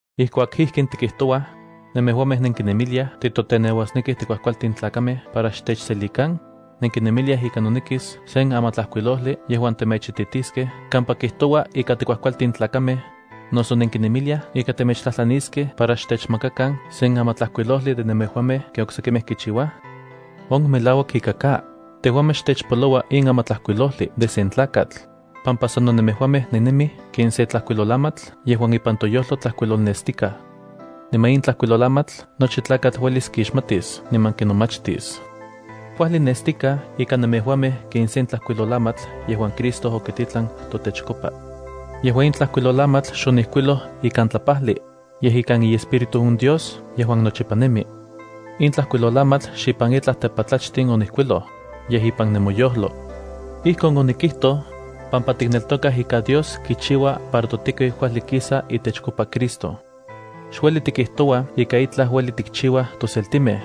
Ijkuak ijkin tikijtouaj, ¿nemejuamej nenkinemiliaj titoteneuasnekij tikuajkualtin tlakamej para xtechselikan? ¿Nenkinemiliaj ika nonekis sen amatlajkuilojli yejuan temechititiskej kampa kijtouaj ika tikuajkualtin tlakamej, noso nenkinemiliaj ika temechtlajtlaniskej para xtechmakakan sen amatlajkuilojli de nemejuamej ken oksekimej kichiuaj? ¡On melauak ika ka! Tejuamej xtechpoloua in amatlajkuilojli de sen tlakatl, pampa sano nemejuamej nennemij ken se tlajkuilolamatl yejuan ipan toyojlo tlajkuilolnestikaj. Niman in tlajkuilolamatl nochi tlakatl uelis kixmatis niman kinomachtis. Kuajli nestikaj ika nemejuamej ken sen tlajkuilolamatl yejuan Cristo okititlan totechkopa. Yejua in tlajkuilolamatl xonijkuiloj ikan tlajpajli, yej ikan iEspíritu on Dios yejuan nochipa nemi. In tlajkuilolamatl xipan itlaj tepatlachtin onijkinkuiloj, yej ipan nemoyojlo. Ijkon onikijtoj, pampa tikneltokaj ika Dios kichiua para totekiu kuajli kisa itechkopa Cristo. Xueli tikijtouaj ika itlaj ueli tikchiuaj toseltimej.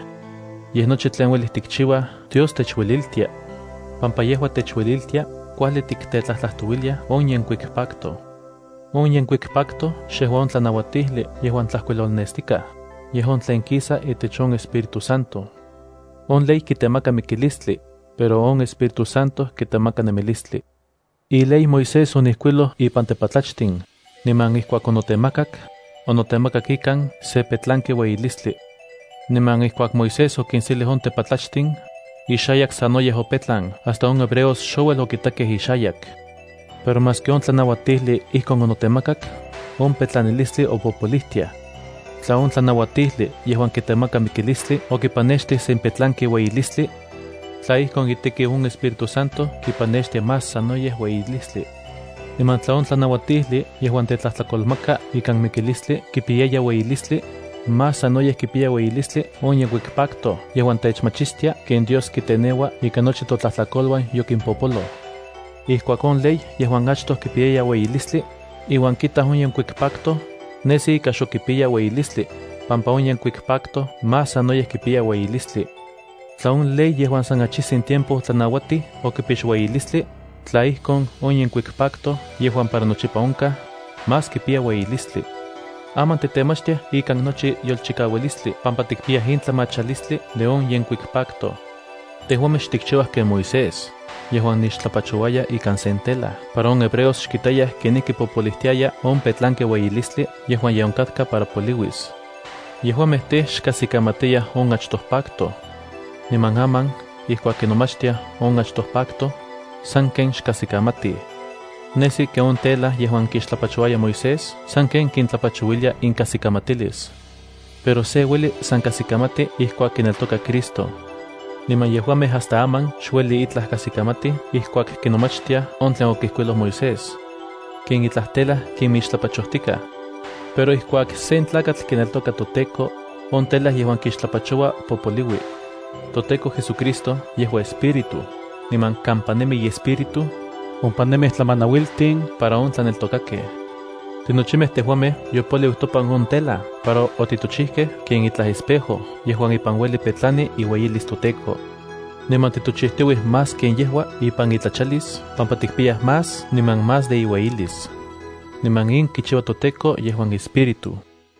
Yej nochi tlen ueli tikchiuaj Dios techueliltia, pampa yejua techueliltia kuajli tiktetlajtlajtouiliaj on yenkuik pacto. On yenkuik pacto xejua on tlanauatijli yejuan tlajkuilolnestikaj, yej on tlen kisa itech on Espíritu Santo. On ley kitemaka mikilistli, pero on Espíritu Santo kitemaka nemilistli. Iley Moisés onijkuiloj ipan tepatlachtin, niman ijkuak onotemakak, onotemakak ikan se petlanki ueyilistli. Niman ijkuak Moisés okinselij on tepatlachtin, ixayak sanoyej opetlan hasta on hebreos xouel okitakej ixayak. Pero maski on tlanauatijli ijkon onotemakak, on petlanalistli opopolijtiaj. Tla on tlanauatijli yejuan kitemaka mikilistli okipanextij sen petlanki ueyilistli, tla ijkon itekiu on Espíritu Santo kipanextia más sanoyej ueyilistli. Niman tla on tlanauatijli yejuan tetlajtlakolmaka ikan mikilistli kipiyaya ueyilistli, más sanoyej kipiya ueyilistli on yenkuik pacto yejuan techmachistia ken Dios kiteneua ika nochi totlajtlakoluan yokimpopoloj. Ijkuak on ley yejuan achtoj kipiyaya ueyilistli, iuan kitaj on yenkuik pacto, nejsi ika xok kipiya ueyilistli, pampa on yenkuik pacto más sanoyej kipiya ueyilistli. Tla on ley yejuan san achijtsin tiempo otlanauatij okipix ueyilistli, on yenkuik pacto, yejuan para nochipa onkaj, más kipiya ueyilistli. Aman titemachtiaj ikan nochi yolchikaualistli pampa tikpiyaj in tlamachalistli de on yenkuik pacto. Tejuamej xtikchiuaj ken Moisés, yejuan nixtlapachouaya ika sen tela para on hebreos xkitayaj kenijki popolijtiaya on petlanki ueyilistli yejuan ye onkatka para poliuis. Yejuamej tej, xkajsikamatiyaj on achtoj pacto. Niman aman, ijkuak kinomachtiaj on achtoj pacto, sanken xkajsikamatij. Nesi ken on tela yejuan kixtlapachouaya Moisés sanken kintlapachouilia inkajsikamatilis. Pero se ueli san kajsikamati ijkuak kineltoka Cristo. Niman yejuamej hasta aman xueli itlaj kajsikamatij ijkuak kinomachtiaj on tlen okijkuiloj Moisés. Ken itlaj tela kinmixtlapachojtikaj. Pero ijkuak sen tlakatl kineltoka toTEKO, on tela yejuan kixtlapachoua popoliui. ToTEKO JesuCristo yejua Espíritu, niman kampa nemi iEspíritu, ompa nemij tlamanauiltin para on tlaneltokakej. Tinochimej tejuamej yopoliu topan on tela para otitochijkej ken itlaj espejo yejuan ipan ueli petlani iueyilis toTEKO. Niman titochijtiuij más ken yejua ipan itlachalis pampa tikpiyaj más niman más de iueyilis. Niman in kichiua toTEKO yejuan Espíritu.